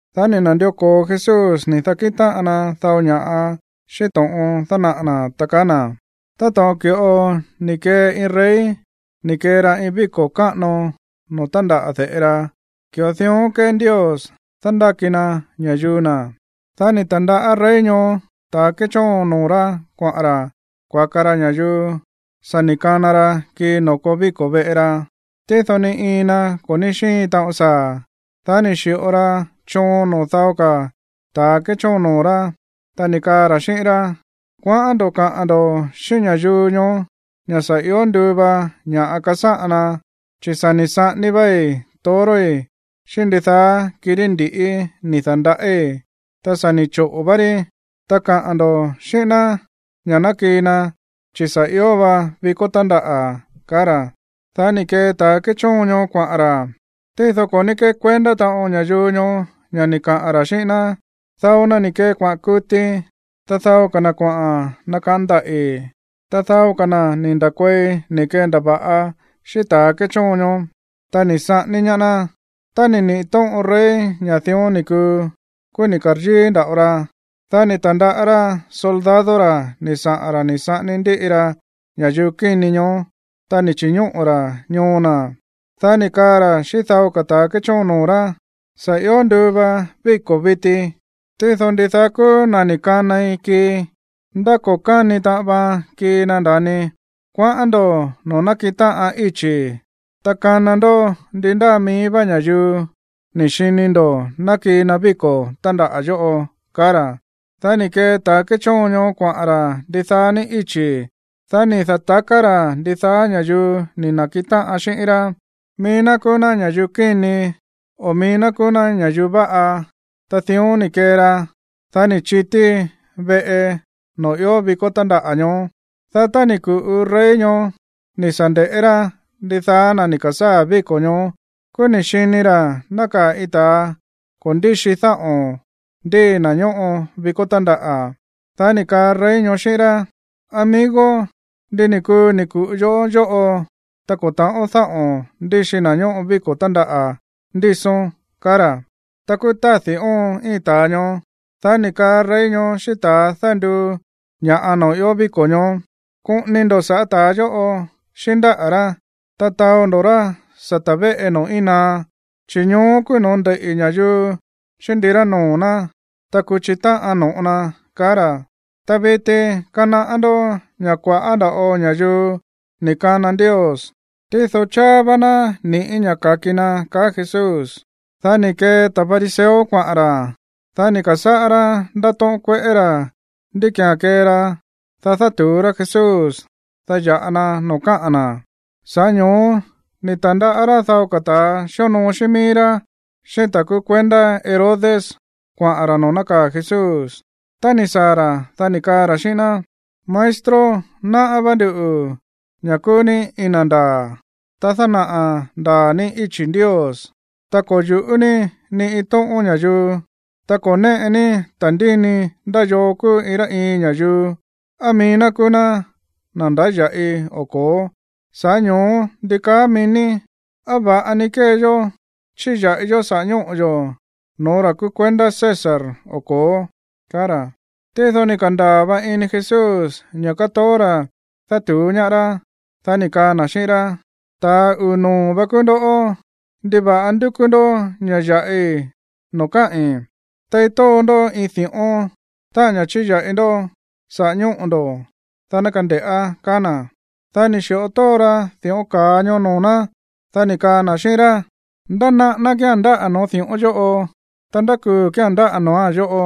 Dá ni̱ na̱ndió ko̱o Jesús ni̱ da̱kíꞌin táꞌan na dao ña̱ꞌa xíꞌín to̱ꞌon dánaꞌa̱ na̱, ta kaá na̱: ―Táto̱ꞌon ki̱ꞌo ni̱ kee iin rey ni̱ kee ra iin víko̱ káꞌano noo̱ tándaꞌa̱ de̱ꞌe ra, ki̱ꞌo dión kée Ndios dándáki na ña̱yuu na̱. Dá ni̱ ta̱ndaꞌá rey ñoó ta̱ kéchóon noo̱ rá kuaꞌa̱n ra̱ kuaka ra ña̱yuu sa̱ ni̱ kana ra kii noo̱ koo víko̱ veꞌe ra. Tído ni iin na ko̱ ní xíin taꞌon saa̱. Dá ni̱ xi̱ꞌo ra choon noo̱ dao ka̱ ta̱ kéchóon noo̱ rá, ta ni̱ kaa ra̱ xíꞌín rá: “Kuaꞌán ndo̱ kaꞌa̱n ndo̱ xíꞌín ña̱yuu ñoó ña̱ sa̱ io nduu va ña̱ꞌa kasáꞌan na, chi̱ sa̱ ni̱ saꞌání váí toroi̱ xíꞌín ndidaá kirí ndi̱ꞌí ni̱ da̱ndaꞌíi̱. Ta sa̱ ni̱ choꞌo̱ vá rí. Ta kaꞌa̱n ndo̱ xíꞌín ná ña̱ ná kii na, chi̱ sa̱ ió va víko̱ tándaꞌa̱”, kaá ra̱. Dá ni̱ kee ta̱ kéchóon ñoó kuaꞌa̱n ra̱. Tído ko̱ ní kékuendá taꞌon ña̱yuu ñoó ña̱ ni̱ kaꞌa̱n ra̱ xíꞌín ná. Dao na ni̱ kee kuaꞌa̱n kuti, ta dao ka̱ na kuaꞌa̱n nakaꞌán ndaꞌi̱, ta dao ka̱ na̱ ni̱ nda̱kuei ni̱ kendava̱ꞌa xíꞌín ta̱ kéchóon ñoó, ta ni̱ saꞌání ñaá ná. Tá ni̱ niꞌi̱ tóꞌon rey ña̱ dión ni̱ kuu, kúú ni̱ ka̱ryíí nda̱ꞌo ra. Dá ni̱ ta̱ndaꞌá rá soldado ra̱ ni̱ saꞌa̱n ra̱ ni̱ saꞌání ndíꞌi ra ña̱yuu kíni ñoó, ta ni̱ chi̱ñóꞌo̱ ra̱ ñoo na̱. Dá ni̱ kaa ra̱ xíꞌín dao ka̱ ta̱ kéchóon noo̱ rá: “Sa̱ ió nduu va víko̱ viti, tído ndidaá kúú na̱ ni̱ kanai kii, ndá ko̱ káni taꞌan vaan kii na, nda̱ni. Kuaꞌán ndo̱ noo̱ nákiꞌin táꞌan íchi̱, ta kana ndó ndi ndáa mií vá ña̱yuu ni̱ xini ndo̱ ná kii na víko̱ tándaꞌa̱ yóꞌo”, kaá ra̱. Dá ni̱ kee ta̱ kéchóon ñoó kuaꞌa̱n ra̱ ndidaá ní íchi̱. Dá ni̱ da̱taká ra̱ ndidaá ña̱yuu ni̱ na̱kiꞌin táꞌan xíꞌín rá, mií ná kúú ná ña̱yuu kíni, o mií ná kúú ná ña̱yuu váꞌa. Ta dión ni̱ kee ra, dá ni̱ chití veꞌe noo̱ ió víko̱ tándaꞌa̱ ñoó. ’Dá tá ni̱ ku̱ꞌu rey ñoó ni̱ sa̱ nde̱ꞌé rá ndidaá na̱ ni̱ ka̱sáa̱ víko̱ ñoó, kúú ni̱ xini ra̱ nákaa̱ iin ta̱a ko̱ ndíxi dáꞌo̱n ndíi na̱ ñóꞌo víko̱ tándaꞌa̱. Dá ni̱ kaa rey ñoó xíꞌín rá: “Amigo, ¿ndi ni̱ kuu ni̱ ku̱ꞌu yoꞌó yóꞌo, ta ko̱ ta̱ꞌón dáꞌo̱n ndíxi na̱ ñóꞌo víko̱ tándaꞌa̱ ndísón?” kaá ra̱. Ta kúú tádi̱ óon íin ta̱a ñoó. Dá ni̱ kaa rey ñoó xíꞌín ta̱a dánduu ña̱ꞌa noo̱ ió víko̱ ñoó: “Koꞌoni ndo̱ sa̱ꞌá ta̱a yóꞌo, xíꞌín ndáꞌa̱ rá, ta taó ndo̱ rá sata̱ véꞌe noo̱ íin naá, chi̱ ñoó kúú no̱ó ndeiꞌi̱ ña̱yuu xíꞌín ndirá noo̱ ná, ta kuchi táꞌan no̱ꞌo na”, kaá ra̱. Ta viti, kanaꞌá ndó ña̱ kua̱ꞌá nda̱ꞌo ña̱yuu ni̱ kana Ndios, tído cháá vá ná ni̱ꞌí ña̱ ka̱ki na ―kaá Jesús. Dá ni̱ kee ta̱ fariseo kuaꞌa̱n ra̱. Dá ni̱ ka̱sáꞌá rá ndátóꞌón kueꞌé ra̱ ndí ki̱án kee ra, dá dátu̱ú rá Jesús, dá ya̱ꞌa na noo̱ káꞌa̱n na̱. Sa̱ꞌá ño̱ó ni̱ ta̱ndaꞌá rá dao ka̱ ta̱ xíonoo xíꞌín mií rá, xíꞌín ta̱ kúú kuendá Herodes kuaꞌa̱n ra̱ noo̱ nákaa̱ Jesús. Tá ni̱ saa̱ ra̱, dá ni̱ kaa ra̱ xíꞌín ná: ―Maestro, náꞌá vá nduꞌu̱ ña̱ kúú ní iin na̱ ndaa̱, ta dánaꞌa̱ ndaa̱ ní íchi̱ Ndios. Ta ko̱ yu̱ꞌú ní ni iin tóꞌón ña̱yuu, ta ko̱ néꞌe ní ta̱ndíni ndá yoo kúú iin rá iin ña̱yuu, á mií ná kúú ná na̱ ndáya̱ꞌi o ko̱ó. Sa̱ꞌá ño̱ó, ¿ndi kaá mií ní? ¿Á va̱ꞌa ni kée yó chíya̱ꞌi yó saꞌa̱ ñóꞌo̱ yo̱ no̱ó ra̱ kúú kuendá César o ko̱ó? ―kaá ra̱. Tído ni̱ ka̱ndaa̱ va ini Jesús ña̱ kátoó ra̱ dátu̱ú ñaá rá. Dá ni̱ kaa na̱ xíꞌín rá: ―¡Ta̱a uu̱ noo̱ vá kúú ndó! ¿Ndiva̱ꞌa ndúkú ndó ña̱ ya̱ꞌi noo̱ káꞌi̱n? Tei tóo ndó iin di̱ꞌón, táꞌa̱n ña̱ chíya̱ꞌi ndó saꞌa̱ ñóꞌo̱ ndo̱, dá ná kande̱ꞌá ―kaá na̱. Dá ni̱ xi̱ꞌo tóo ra di̱ꞌón ka̱a ñoó noo̱ ná. Dá ni̱ kaa na̱ xíꞌín rá: ―¿Ndá naꞌáná kía̱n ndáꞌa̱ noo̱ di̱ꞌón yóꞌo? ¿Ta ndá kuu̱ kía̱n ndáꞌa̱ noo̱án yóꞌo?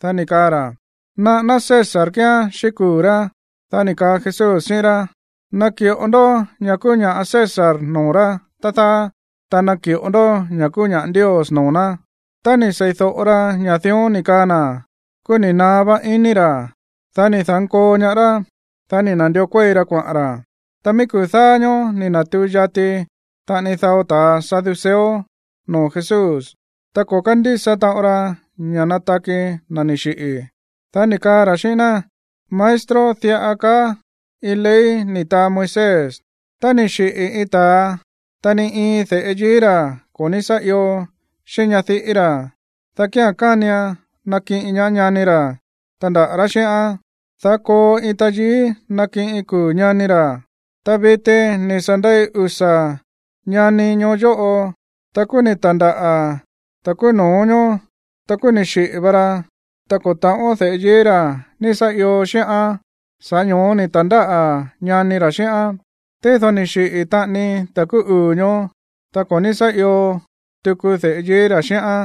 Dá ni̱ kaa ra̱: ―Naꞌáná César kíán xíꞌín kuu̱ rá. Dá ni̱ kaá Jesús xíꞌín rá: ―Naki̱ꞌo ndó ña̱ kúú ña̱ꞌa César noo̱ rá, tá dáá, ta naki̱ꞌo ndó ña̱ kúú ña̱ꞌa Ndios noo̱ ná. Tá ni̱ sei̱do̱ꞌo ra ña̱ dión ni̱ kaꞌa̱n na̱, kúú ni̱ naá vá iní ra̱. Dá ni̱ da̱nkoo ñaá rá, dá ni̱ na̱ndió kuéi ra kuaꞌa̱n ra̱. Ta mií kuu̱ dáá ñóó ni̱ na̱tuu yati taꞌani dao ta̱ saduceo noo̱ Jesús. Ta ko̱ kándísa taꞌon ra ña̱ nataki na̱ ni̱ xiꞌi̱. Dá ni̱ kaa ra̱ xíꞌín ná: ―Maestro, diꞌa kaá iin ley ni̱ taa Moisés: “Tá ni̱ xiꞌi̱ iin ta̱a, ta ni iin de̱ꞌe yií ra̱ ko̱ ní sá io xíꞌín ñadiꞌí ra̱, dá kía̱n kánian nakiꞌin ñaá ñani ra̱ tandaꞌa̱ ra̱ xíꞌán, dá koo iin tayií nakiꞌin kuu̱ ñani ra̱.” Ta viti, ni̱ sa̱ ndei usa̱ ñani ñoo yóꞌo. Ta kúú ni̱ ta̱ndáꞌa̱ ta̱ kúú no̱ó ñoó. Ta kúú ni̱ xiꞌi̱ va ra, ta ko̱ ta̱ꞌón de̱ꞌe yií ra̱ ni̱ sa̱ io xíꞌán. Sa̱ꞌá ño̱ó ni̱ ta̱ndáꞌa̱ ñani ra̱ xíꞌán. Tído ni̱ xiꞌi̱ taꞌani ta̱ kúú uu̱ ñoó, ta ko̱ ní sá io tuku de̱ꞌe yií ra̱ xíꞌán.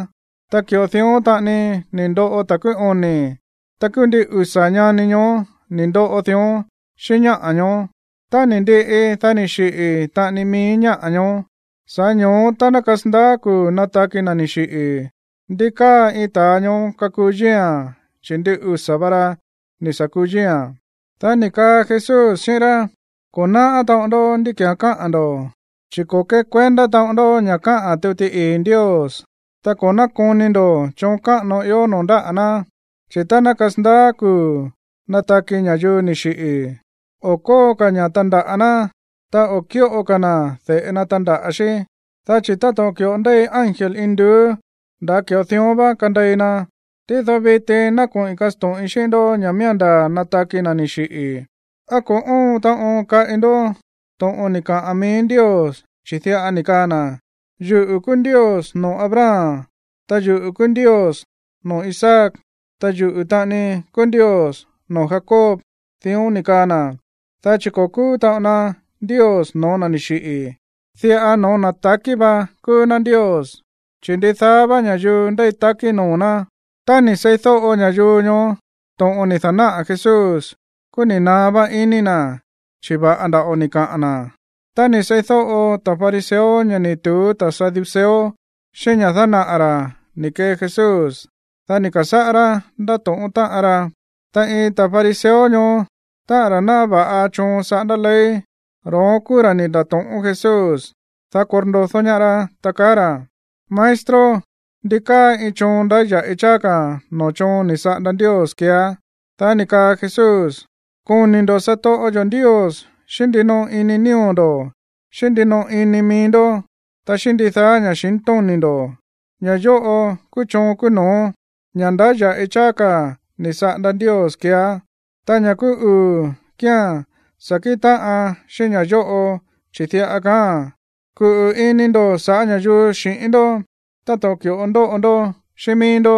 Ta ki̱ꞌo dión taꞌani ni̱ ndoꞌo ta̱ kúú oni̱. Ta kúú ndin usa̱ ñani ñoó ni̱ ndoꞌo dión xíꞌín ñáꞌa̱ ñoó. Tá ni̱ ndiꞌi, dá ni̱ xiꞌi̱ taꞌani mií ñáꞌa̱ ñoó. Sa̱ꞌá ño̱ó, tá ná kasandaá kuu̱ nataki na̱ ni̱ xiꞌi̱, ¿ndi káa iin ta̱a ñoó kakuu yíi̱a̱n, chi̱ ndin usa̱ va ra ni̱ sa̱ kuu yíi̱a̱n? Dá ni̱ kaa Jesús xíꞌín rá: ―Ko̱ náꞌá taꞌon ndó ndí ki̱án káꞌa̱n ndo̱, chi̱ ko̱ kékuendá taꞌon ndó ña̱ káꞌa̱n tuti ii̱ Ndios, ta ko̱ nákoni ndo̱ choon káꞌano ió noo̱ ndáꞌa̱ ná. Chi̱ tá ná kasandaá kuu̱ nataki ña̱yuu ni̱ xiꞌi̱, o̱ kóo ka̱ ña̱ tandaꞌa̱ ná, ta o̱ kíꞌo ka̱ na̱ de̱ꞌe na tandaꞌa̱ xí, dá chi̱ táto̱ꞌon ki̱ꞌo ndéi ángel induú, nda̱ ki̱ꞌo dión vá kandei na. Tído viti ná koꞌi̱n kasto̱ꞌin xíꞌín ndó ña̱ miía̱n nataki na̱ ni̱ xiꞌi̱. ¿Á ko̱ óon taꞌon kaꞌi ndó to̱ꞌon ni̱ kaꞌa̱n mií Ndios, chi̱ diꞌa ni̱ kaa na̱: “Yuꞌu̱ kúú Ndios noo̱ Abraham, ta yuꞌu̱ kúú Ndios noo̱ Isaac, ta yuꞌu̱ taꞌani kúú Ndios noo̱ Jacob”? Dión ni̱ kaa na̱, dá chi̱ ko̱ kúú taꞌon na Ndios no̱ó na̱ ni̱ xiꞌi̱, diꞌa no̱ó na̱ ta̱kí vá kúú ná Ndios, chi̱ ndidaá vá ña̱yuu ndéi takí noo̱ ná. Tá ni̱ seídóꞌo ña̱yuu ñoó to̱ꞌon ni̱ da̱náꞌa̱ Jesús, kúú ni̱ naá vá iní na̱, chi̱ va̱ꞌa nda̱ꞌo ni̱ kaꞌa̱n na̱. Tá ni̱ seídóꞌo ta̱ fariseo ña̱ ni̱ tu̱ú ta̱ saduceo xíꞌín ña̱ dánaꞌa̱ ra̱ ni̱ kee Jesús, dá ni̱ ka̱sáꞌá rá ndátóꞌón táꞌan ra. Ta iin ta̱ fariseo ñoó, táꞌa̱n ra̱ náꞌá va̱ꞌa choon saꞌándá ley, ro̱ón kúú ra̱ ni̱ nda̱to̱ꞌón Jesús, dá korndodó ñaá rá, ta kaá ra̱: ―Maestro, ¿ndi káa iin choon ndáya̱ꞌi cháá ka̱ noo̱ choon ni̱ saꞌanda Ndios keeá? Dá ni̱ kaa Jesús: ―“Koni̱ ndo̱ satoꞌo yo̱ Ndios xíꞌín ndinoꞌo ini nío̱ ndo̱, xíꞌín ndinoꞌo ini mií ndó, ta xíꞌín ndidaá ña̱xintóni̱ ndo̱.” Ña̱ yóꞌo kúú choon kúú no̱ó, ña̱ ndáya̱ꞌi cháá ka̱ ni̱ saꞌanda Ndios keeá. Ta ña̱ kúú uu̱ kía̱n sa̱ kíꞌin táꞌan xíꞌín ña̱ yóꞌo, chi̱ diꞌa kaáa̱n: “Kuꞌu̱ ini ndo̱ sa̱ꞌá ña̱yuu xi̱ꞌín ndó táto̱ꞌon ki̱ꞌo ndóꞌo ndó xíꞌín míí ndó.”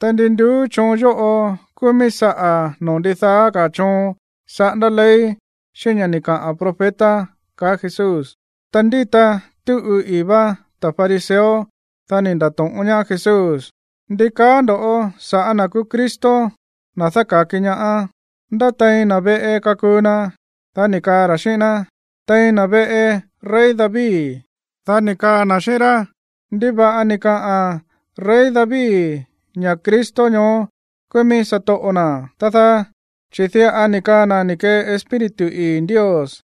Ta ndi nduú choon yóꞌo kúú míí saꞌa̱ noo̱ ndidaá ka̱ choon saꞌándá ley, xíꞌín ña̱ ni̱ kaꞌa̱n profeta ―kaá Jesús. Ta ndíta túꞌu ii̱ vá ta̱ fariseo. Dá ni̱ nda̱to̱ꞌón ñaá Jesús: ―¿Ndi kaá ndo̱ sa̱ꞌá na̱ kúú Cristo, na̱ dáka̱ki ñaá? ¿Ndá tein na̱ veꞌe kakuu na? Dá ni̱ kaa ra̱ xíꞌín ná: ―Tein na̱ veꞌe rey David. Dá ni̱ kaa na̱ xíꞌín rá: ―¿Ndiva̱ꞌa ni̱ kaa rey David ña̱ Cristo ñoó kúú mií satoꞌo na̱, tá dáá? Chi̱ diꞌa ni̱ kaa na̱ ni̱ kee Espíritu ii̱ Ndios: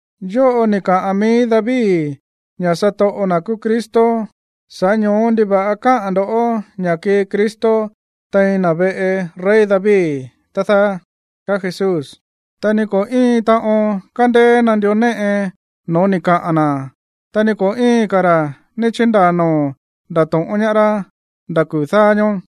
Yóꞌo ni̱ kaꞌa̱n mií David ña̱ satoꞌo na̱ kúú Cristo, sa̱ꞌá ño̱ó, ¿ndiva̱ꞌa káꞌa̱n ndo̱ ña̱ kii Cristo tein na̱ veꞌe rey David, tá dáá? ―kaá Jesús. Ta ni ko̱ íin taꞌon kándéé nandió néꞌe no̱ó ni̱ kaꞌa̱n na̱, ta ni ko̱ íin ka̱ ra̱ ní chíndaa̱ noo̱ ndato̱ꞌón ñaá rá nda̱ kuu̱ dáá ñóó.